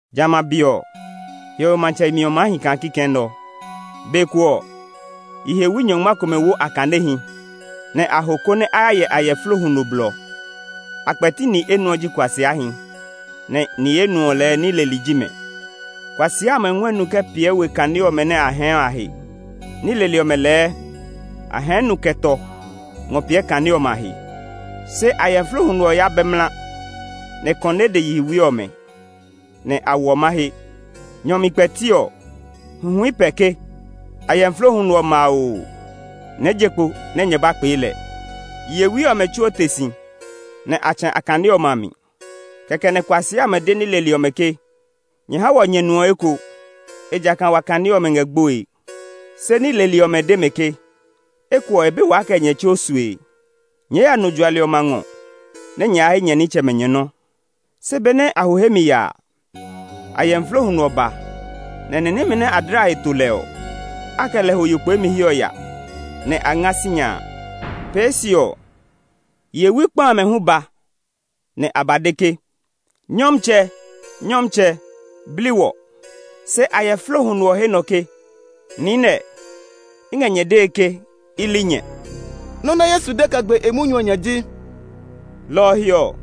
“Jamɛ a be ɔ, hiɔwe matsɛ yemi ɔ maa hi kaa kikɛ nɛ ɔ. Be ko ɔ, yihewi nyɔngma komɛ wo a kanehi, nɛ a ho konɛ a ya hyɛ ayɛflo huno blɔ. A kpɛti ni enuɔ ji kuasiahi, nɛ ni enuɔ lɛɛ ní leli ji mɛ. Kuasia amɛ ngɔɛ nu kɛ piɛ we kane ɔmɛ nɛ a hɛɛ ɔ a he. Ní leli ɔmɛ lɛɛ a hɛɛ nu kɛ tɔ ngɔ piɛ a kane ɔmɛ a he. Se ayɛflo huno ɔ ya bɛ mla, nɛ kɔnɛɛ de yihewi ɔmɛ, nɛ a hwɔ mahe. “Nyɔ mi kpɛti ɔ, huhui pɛ ke, ‘Ayɛflo huno ɔ ma oo! Nyɛɛ je kpo nɛ nyɛ ba kpee lɛ!’ Yihewi ɔmɛ tsuo te si, nɛ a tsɛ̃ a kane ɔmɛ a mi. Kɛkɛ nɛ kuasia amɛ de ní leli ɔmɛ ke, ‘Nyɛ ha wɔ nyɛ nu ɔ eko, ejakaa wa kane ɔmɛ ngɛ gboe.’ Se ní leli ɔmɛ de mɛ ke, ‘Eko ɔ, e ba be waa kɛ nyɛ tsuo sue; nyɛɛ ya nu juali ɔmɛ a ngɔ nɛ nyɛ ya he nyɛ nitsɛmɛ nyɛ nɔ́.’ Se benɛ a ho hemi ya a, ayɛflo huno ɔ ba, nɛ ni nɛmɛ nɛ dla a he to lɛ ɔ, a kɛ lɛ ho yo kpeemi he ɔ ya. Nɛ a nga sinya a. “Pee se ɔ, yihewi kpa amɛ hu ba, nɛ a ba de ke, ‘Nyɔmtsɛ! Nyɔmtsɛ! Bli wɔ!’ Se ayɛflo huno ɔ he nɔ ke, ‘Niinɛ, i ngɛ nyɛ dee ke i li nyɛ.’” Nɔ́ nɛ Yesu de kɛ gbe e munyu ɔ nya ji, “Lɔ ɔ he ɔ,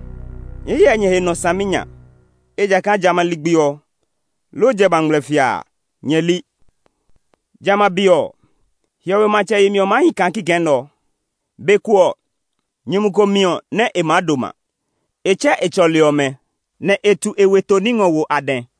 nyɛɛ hyɛ nyɛ he nɔ saminya, ejakaa jamɛ a ligbi ɔ, loo jamɛ a ngmlɛfia a, nyɛ li. “Jamɛ a be ɔ, hiɔwe matsɛ yemi ɔ maa hi kaa kikɛ nɛ ɔ: Be ko ɔ, nyumu ko miɔ nɛ e maa doma. E tsɛ e tsɔli ɔmɛ, nɛ e tu e weto ní ngɔ wo a dɛ.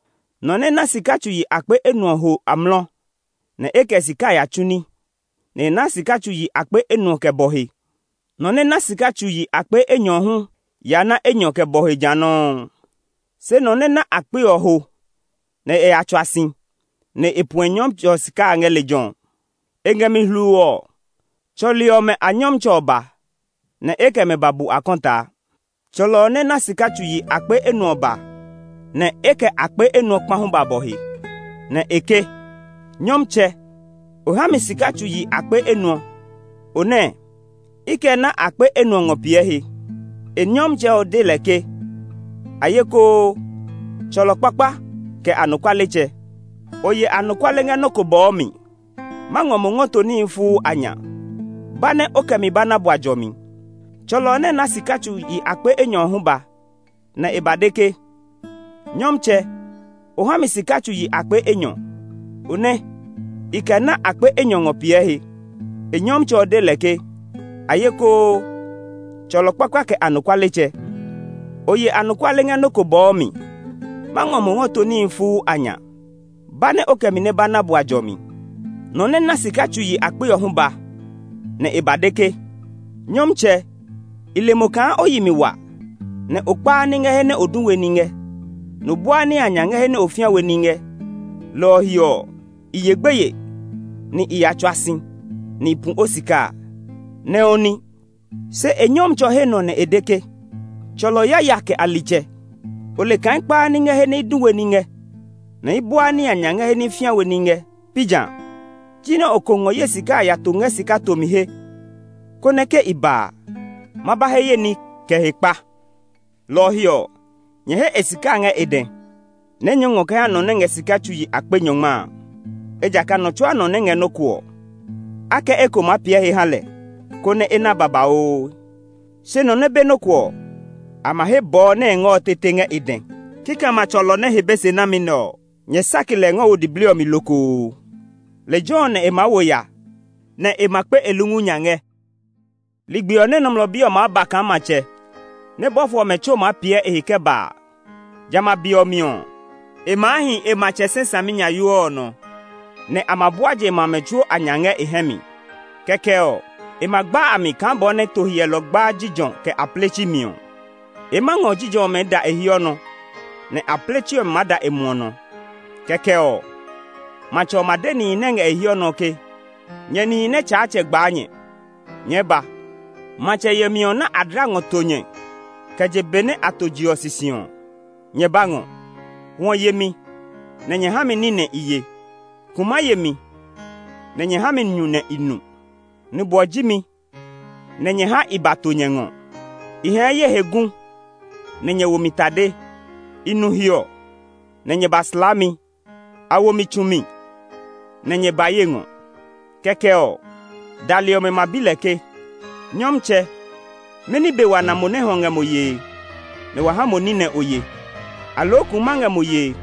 Nɔ nɛ na sika tsu yi akpe enuɔ ɔ ho amlɔ, nɛ e kɛ sika a ya tsu ní; nɛ e na sika tsu yi akpe enuɔ kɛ bɔ he. Nɔ nɛ na sika tsu yi akpe enyɔ ɔ hu ya na enyɔ kɛ bɔ he ja nɔuu. Se nɔ nɛ na akpe ɔ ho nɛ e ya tsua si, nɛ e pu e nyɔmtsɛ ɔ sika a ngɛ lejɛ ɔ. “E ngɛ mi hluu ɔ, tsɔli ɔmɛ a nyɔmtsɛ ɔ ba, nɛ e kɛ mɛ ba bu akɔtaa. Tsɔlɔ ɔ nɛ na sika tsu yi akpe enuɔ ɔ ba, nɛ e kɛ akpe enuɔ kpa hu ba bɔ he. Nɛ e ke, ‘Nyɔmtsɛ, o ha mi sika tsu yi akpe enuɔ. O nɛ, i kɛ na akpe enuɔ ngɔ piɛ he.’ E nyɔmtsɛ ɔ de lɛ ke, ‘Ayekoo, tsɔlɔ kpakpa, kɛ anɔkualetsɛ! O ye anɔkuale ngɛ nɔ́ ko bɔɔ mi; ma ngɔ mo ngɔ to níhi fuu a nya. Ba nɛ o kɛ mi ba na bua jɔmi!’ “Tsɔlɔ ɔ nɛ na sika tsu yi akpe enyɔ ɔ hu ba, nɛ e ba de ke, ‘Nyɔmtsɛ, o ha mi sika tsu yi akpe enyɔ. O nɛ, i kɛ na akpe enyɔ ngɔ piɛ he.’ E nyɔmtsɛ ɔ de lɛ ke, ‘Ayekoo, tsɔlɔ kpakpa, kɛ anɔkualetsɛ! O ye anɔkuale ngɛ nɔ́ ko bɔɔ mi; ma ngɔ mo ngɔ to níhi fuu a nya. Ba nɛ o kɛ mi ba na bua jɔmi!’ “Nɔ nɛ na sika tsu yi akpe ɔ hu ba, nɛ e ba de ke, ‘Nyɔmtsɛ, i le mo kaa o yi mi wa; o kpaa ní ngɛ he nɛ o du we ní ngɛ, nɛ o buaa ní nya ngɛ he nɛ o fĩa we ní ngɛ. Lɔ ɔ he ɔ, i ye gbeye, nɛ i ya tsua si, nɛ i pu o sika a. Ne o ní!’ “Se e nyɔmtsɛ ɔ he nɔ nɛ e de ke, ‘Tsɔlɔ yaya kɛ alitsɛ! O le kaa i kpaa ní ngɛ he nɛ i du we ní ngɛ, nɛ i buaa ní nya ngɛ he nɛ i fĩa we ní ngɛ; pi jã? Jinɛ o ko ngɔ ye sika a ya to ngɛ sika tomi he, konɛ ke i ba a, ma ba he ye ní kɛ hekpa. Lɔ ɔ he ɔ, nyɛ he e sika a ngɛ e dɛ, nɛ nyɛɛ ngɔ kɛ ha nɔ nɛ ngɛ sika tsu yi akpe nyɔngma a. Ejakaa nɔ tsuaa nɔ nɛ ngɛ nɔ́ ko ɔ, a kɛ eko maa piɛ he ha lɛ, konɛ e na babauu. Se nɔ nɛ be nɔ́ ko ɔ, a ma he bɔɔ nɛ e ngɛ ɔ tete ngɛ e dɛ. Kikɛmɛ a tsɔlɔ nɛ he be se nami nɛ ɔ, nyɛ sake lɛ ngɔ wo diblii ɔ mi lokoo. Lejɛ ɔ nɛ e maa wo ya, nɛ e ma kpe e lungu nya ngɛ.’ “Ligbi ɔ nɛ Nɔmlɔ Bi ɔ maa ba kaa matsɛ, nɛ bɔfo ɔmɛ tsuo maa piɛ e he kɛ ba a, jamɛ a be ɔ mi ɔ, e maa hi e matsɛ sɛ saminyayoo ɔ nɔ, nɛ a ma bua je ma amɛ tsuo a nya ngɛ e hɛ mi. Kɛkɛ ɔ, e ma gba a mi kaa bɔ nɛ to hyɛlɔ gbaa jijɔ, kɛ apletsi mi ɔ. E maa ngɔ jijɔ ɔmɛ ngɔ da e hiɔ nɔ, nɛ apletsi ɔmɛ maa da e muɔ nɔ. Kɛkɛ ɔ, matsɛ ɔ ma de nihi nɛ ngɛ e hiɔ nɔ ɔ ke, ‘Nyɛ nihi nɛ Tsaatsɛ gbaa nyɛ, nyɛɛ ba! Matsɛ yemi ɔ nɛ a dla ngɔ to nyɛ kɛ je be nɛ a to je ɔ sisi ɔ, nyɛ ba ngɔ. Hwɔ ye mi, nɛ nyɛ ha mi ní nɛ i ye; kuma ye mi, nɛ nyɛ ha mi nyu nɛ i nu; nubwɔ ji mi, nɛ nyɛ ha i ba to nyɛ ngɔ. I hɛɛ ye he gu, nɛ nyɛ wo mi tade. I nu hiɔ, nɛ nyɛ ba slaa mi; a wo mi tsu mi, nɛ nyɛ ba ye ngɔ.’ “Kɛkɛ ɔ, dali ɔmɛ ma bi lɛ ke, ‘Nyɔmtsɛ, mɛni be wa na mo nɛ hwɔ ngɛ mo yee, nɛ wa ha mo ní nɛ o ye, aloo kuma ngɛ mo yee,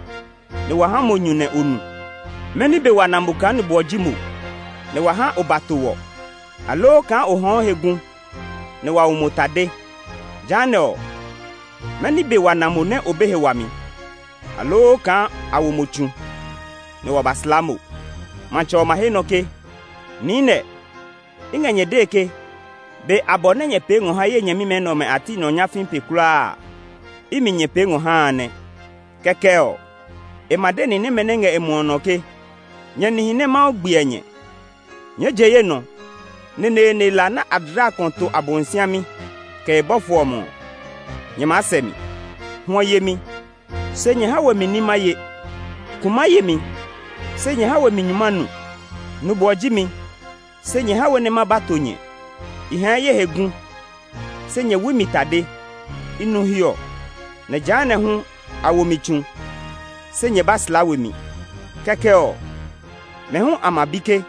nɛ wa ha mo nyu nɛ o nu? Mɛni be wa na kaa nubwɔ ji mo, nɛ wa ha o ba to wɔ, aloo kaa o hɛɛ o he gu, nɛ wa wo mo tade? Jehanɛ ɔ, mɛni be wa na mo nɛ o be he wami, aloo kaa a wo mo tsu, nɛ wa ba slaa mo?’ Matsɛ ɔ ma he nɔ ke, ‘Niinɛ, i ngɛ nyɛ dee ke, be abɔ nɛ nyɛ pee ngɔ ha ye nyɛmimɛ nɛ ɔmɛ a ti nɔ nyafii pe kulaa a, imi nyɛ pee ngɔ ha a nɛ!’ “Kɛkɛ ɔ, e ma de ni nɛmɛ nɛ ngɛ e muɔ nɔ ɔ ke, ‘Nyɛ nihi nɛ Mawu gbiɛ nyɛ, nyɛɛ je ye nɔ! Neneene la nɛ a dla ngɔ to Abosiami, kɛ e bɔfo ɔmɛ ɔ, nyɛ ya sɛ mi! Hwɔ ye mi, se nyɛ ha we mi ní ma ye; kuma ye mi, se nyɛ ha we mi nyu ma nu; Nubwɔ ji mi, se nyɛ ha we nɛ ma ba to nyɛ; i hɛɛ ye he gu, se nyɛ wui mi tade; i nu hiɔ, nɛ jehanɛ hu a wo mi tsu, se nyɛ ba slaa we mi.’ “Kɛkɛ ɔ, mɛ hu a ma bi ke,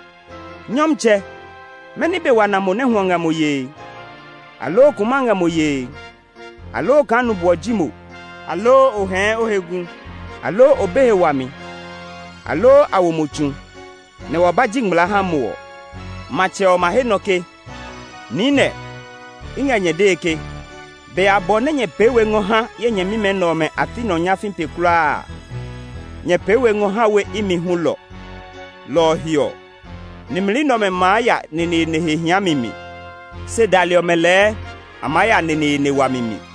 ‘Nyɔmtsɛ, mɛni be wa na mo nɛ hwɔ ngɛ mo yee, aloo kuma ngɛ mo yee, aloo kaa nubwɔ ji mo, aloo o hɛɛ o he gu, aloo o be he wami, aloo a wo mo tsu, nɛ wa ba ji ngmlaa ha mo ɔ?’ Matsɛ ɔ ma he nɔ ke, ‘Niinɛ, i ngɛ nyɛ dee ke, be abɔ nɛ nyɛ pee we ngɔ ha ye nyɛmimɛ nɛ ɔmɛ a ti nɔ nyafii pee kulaa a, nyɛ pee we ngɔ ha we imi hulɔ.’ Lɔ ɔ he ɔ, nimli nɛ ɔmɛ maa ya neneene he hiami mi; se dali ɔmɛ lɛɛ a maa ya neneene wami mi.”